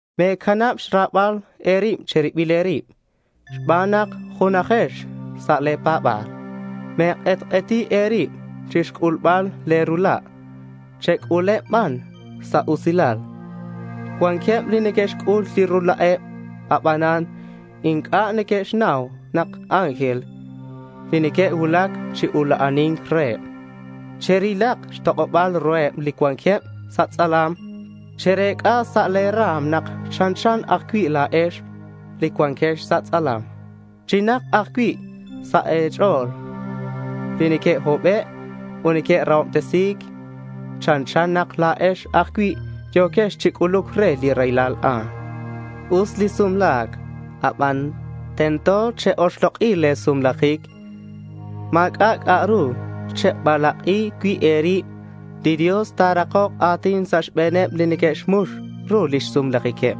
Me̱canab xra̱bal e̱rib che̱ribil e̱rib xban nak junajex sa' le̱ pa̱ba̱l. Me̱k'etk'eti e̱rib chixc'ulbal le̱ rula'. Chec'uleb ban sa' usilal. Cuanqueb li que'xc'ul li rula'eb, abanan inc'a' neque'xnau nak ángel li que'cuulac chi ula'ani̱nc reheb. Cherilak xtok'oba̱l ruheb li cuanqueb sa' tz'alam. Cherec'a̱k sa' le̱ ra̱m nak chanchan ajcui' la̱ex li cuanquex sa' tz'alam. Chinak ajcui' sa' e̱ch'o̱l li neque'hobe' ut li neque'rahobtesi̱c. Chanchan nak la̱ex ajcui' yo̱quex chi c'uluc re li raylal a'an. Us li sumla̱c aban tento che-oxlok'i le̱ sumlajic. Ma̱c'a' c'a'ru chebalak'i cui' e̱rib. Li Dios ta̱rakok a̱tin sa' xbe̱neb li neque'xmux ru lix sumlajiqueb,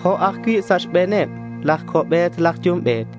jo' ajcui' sa' xbe̱neb laj co'be̱t laj yumbe̱t.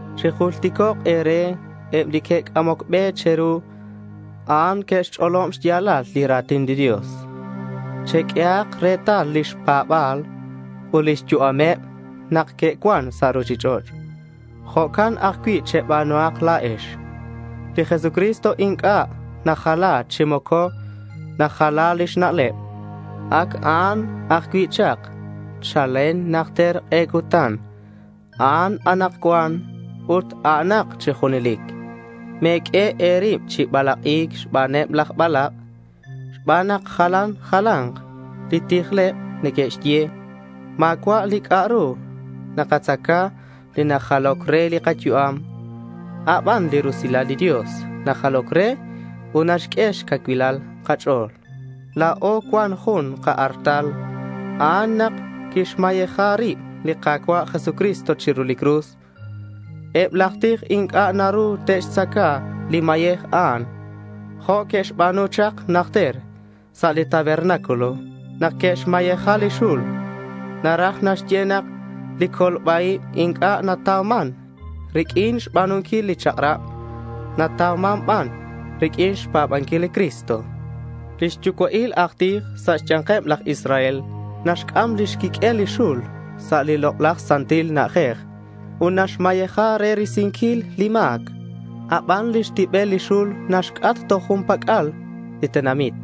Chijulticok' e̱re eb li que'c'amoc be che̱ru. A'an que'xch'olob xya̱lal li ra̱tin li Dios. Cheq'uehak retal lix pa̱ba̱l ut lix yu'ameb nak que'cuan sa' ruchich'och'. Jo'can ajcui' cheba̱nuhak la̱ex. Li Jesucristo inc'a' najala chi moco najala lix na'leb. Ac a'an ajcui' chak chalen najter k'e cutan, a'an anakcuan ut a'anak chi junelic. Me̱q'ue e̱rib chi balak'i̱c xbaneb laj balak', xban nak jalan jala̱nk li tijleb neque'xye. Ma̱cua' li c'a'ru nakatzaca li najaloc re li kayu'am. A' ban li rusilal li Dios najaloc re ut naxq'ue xcacuil kach'o̱l. La̱o cuan jun ka-artal. A'an nak quixmayeja rib li Ka̱cua' Jesucristo chiru li cruz. Eb laj tij inc'a' naru te'xtzaca li mayej a'an jo' que'xba̱nu chak najter sa' li tabernáculo nak que'xmayeja li xul. (Naraj naxye nak li colba-ib inc'a' natauman riq'uin xba̱nunquil li chak'rab. Natauman ban riq'uin xpa̱banquil li Cristo.) Lix yucua'il aj tij sa' xya̱nkeb laj Israel naxc'am lix quiq'uel li xul sa' li Lok'laj Santil Na'ajej ut naxmayeja re risinquil li ma̱c. Aban lix tibel li xul naxc'at toj jun pac'al li tenamit.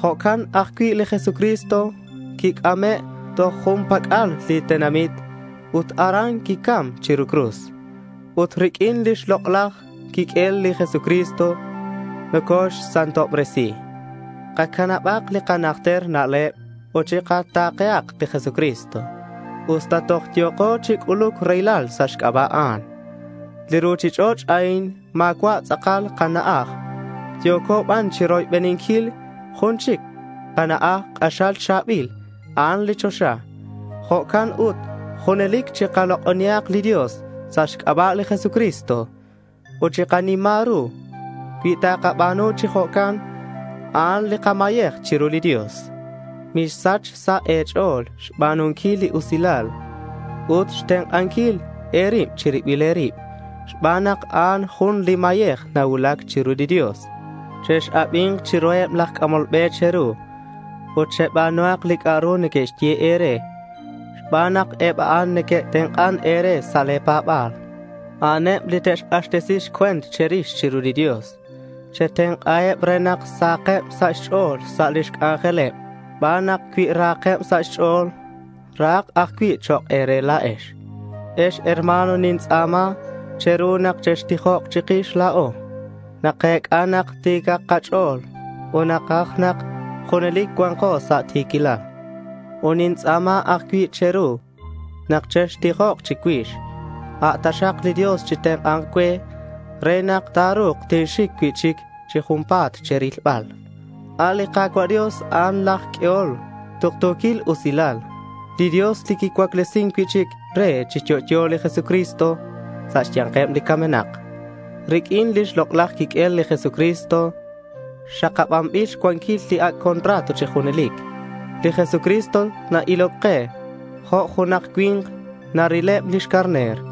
Jo'can ajcui' li Jesucristo quic'ame' toj jun pac'al li tenamit ut aran quicam chiru li cruz. Ut riq'uin lix lok'laj quiq'uel li Jesucristo nocoxsantobresi. Kacanabak li kanajter na'leb ut chikata̱kehak li Jesucristo usta toj yo̱ko chi c'uluc raylal sa' xc'aba' a'an. Li ruchich'och' a'in ma̱cua' tz'akal kana'aj. Yo̱co ban chiroybeninquil jun chic li kana'aj k'axal cha̱bil. A'an li choxa. Jo'can ut junelic chikalok'onihak li Dios sa' xc'aba' li Jesucristo, ut chikanima̱k ru. Cui takaba̱nu chi jo'can, a'an li kamayej chiru li Dios. Misach sa' e̱ch'o̱l xba̱nunquil li usilal ut xtenk'anquil e̱rib che̱ribil e̱rib xban nak a'an jun li mayej nacuulac chiru li Dios. Chex-abi̱nk chiruheb laj c'amol be che̱ru, ut cheba̱nuhak li c'a'ru neque'xye e̱re xban nak eb a'an neque'tenk'an e̱re sa' le̱ pa̱ba̱l. A'aneb li te'xk'axtesi xcue̱nt che̱rix chiru li Dios. Chetenk'aheb re nak sahakeb sa' xch'o̱l sa' lix c'anjeleb xban nak cui rahakeb sa' xch'o̱l, rahak ajcui' chok' e̱re la̱ex. Ex herma̱n, tintz'a̱ma che̱ru nak chextijok chikix la̱o. Nakec'a nak ti̱c kach'o̱l ut nakaj nak junelic cua̱nko sa' ti̱quilal. Ut nintz'a̱ma ajcui' che̱ru nak chextijok chicuix. A' taxak li Dios chitenk'a̱nk cue re nak ta̱ru̱k tinxic cui'chic chi junpa̱t che̱rilbal. A' li Ka̱cua' Dios a'an laj q'uehol tuktu̱quil usilal, li Dios li quicuaclesin cui'chic re chi yo'yo li Jesucristo sa' xya̱nkeb li camenak. Riq'uin lix lok'laj quiq'uel li Jesucristo xakabanbil xcuanquil li ac' contrato chi junelic. Li Jesucristo na-iloc ke jo' junak cui̱nk narileb lix carner.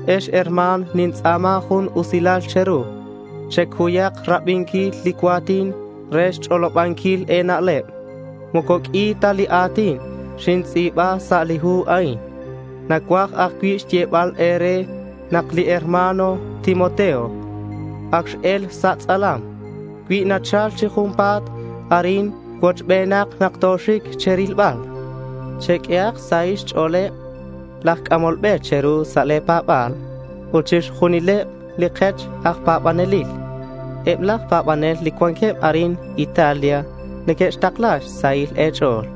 Ex herma̱n, nintz'a̱ma jun usilal che̱ru. Checuyak rabinquil li cua̱tin re xch'olobanquil e̱na'leb. Moco q'ui ta li a̱tin xintz'i̱ba sa' li hu a'in. Nacuaj ajcui' xyebal e̱re nak li hermano Timoteo ac x-el sa' tz'alam. Cui nachal chi junpa̱t arin, cuochbenak nak toxic che̱rilbal. Cheq'uehak xsahil xch'o̱leb laj c'amol be che̱ru sa' le̱ pa̱ba̱l ut chixjunileb li kech aj pa̱banelil. Eb laj pa̱banel li cuanqueb arin Italia neque'xtakla xsahil e̱ch'o̱l.